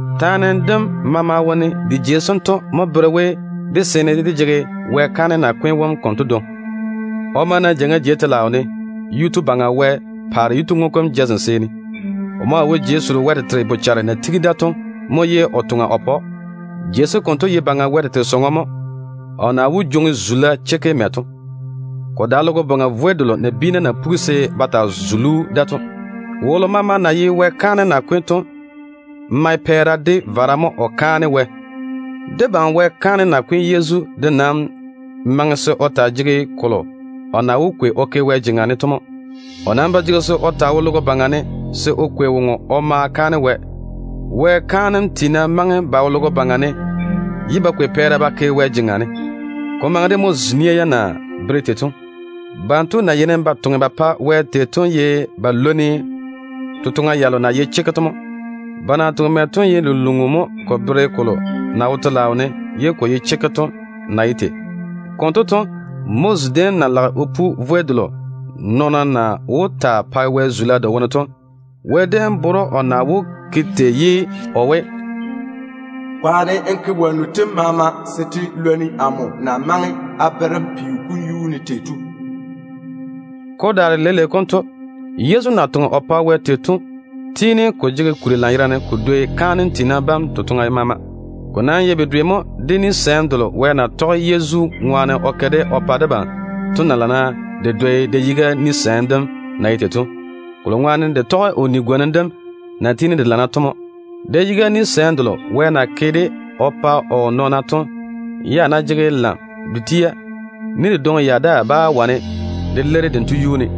Taane dem maama wone de jei sento mo bere we, dé seene dé jege Wɛ kaanem nakwe tu wom konto dwoŋi. O ma na jeiŋa jei telaao ne Yuu-tu Baŋa Wɛ paare yituŋu kom jazem seeni. O maa wo Wɛ wara-jei sem ne mo o toŋa o pa‑o. Jei sem konto ye Baŋa Wɛ tete nyem chekke mo, ye ko dae logo baŋa vwei delo nabiina na pugi se ba taa zuli‑o da to. Wolo maama na ye Wɛ kaanem nakwe tu to mae vara de pɛɛra dwi dwi mo o kaane Wɛ. Debam Wɛ kaanem nakwe tu Yezu de nam maŋe se o taa jege kolo o na wó kwei o ke Wɛ jeŋa ne to mo. O nam ba jege se o taa wo logo baŋa ne se o kwei woŋo o ma kaane Wɛ. Wɛ kaanem tiina maŋe ba wo logo baŋa ne, ye ba kwei pɛɛra ba ke Wɛ jeŋa ne, se ko maŋe de Moses nia yam na bere tei to. Banto na yeini ba toŋe ba pa Wɛ tei to ye ba lwoni totoŋa yalo na ye chekke to mo. Ba na toŋe mɛ to ye lunluŋu mo ko bere kolo na wo telaao ne ye ko ye chekke to na ye tei. Konto to, Moses déem na lage o pu Wɛ wara-vwei dem to, Wɛ déem bere‑o o na wó ke tei ye o we, “Kwaane n ke wonnu tem maama se te lwoni amo na maŋe a bere‑m peo kom yuu ne tei to.” Ko daare leile konto, Yezu na toŋe o pa Wɛ tei to tiini ko jege kuri lanyerane ko dwoi kaanem tiina bam totoŋa maama. Ko nam ye bedwe mo de ni-gwonim delo Wɛ na tɔge Yezu ŋwaane o ke o pa debam to na dwoi da-yiga ni-gwonim dem na ye tei to, de na tɔge o kampwola kam na tiini ka lana to ŋwaane mo. Da-yiga ni-gwonim delo Wɛ na ke o pa o nɔɔna to ya ná ba jege gɛɛre, ni dedwoŋi ya daa bá wane de leiri dento yuu ne.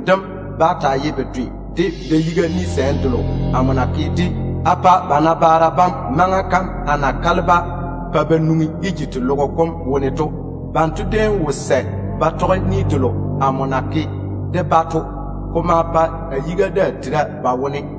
Dento nam bá taa ye bedwe de ni delo a déem na gwoni de ba nabaara bam maŋa kam a na mɛ a jeŋa a ja-ba a nwoŋi Ejipti teo kom wone to. Banto déem wo sɛ ba tɔge amo ni-gwonim dem konto. Ko ma pa a yiga daa tere ba wone.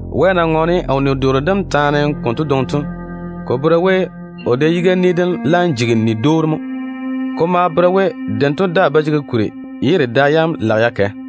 Wɛ na ŋɔɔne o ni-doore dem taane konto dwoŋi to, ko bere we o da-yiga ni dem laam jigi ni-dwoori mo. Ko maa bere we dento daa ba jege kuri, ye de da yam lage ya kɛ.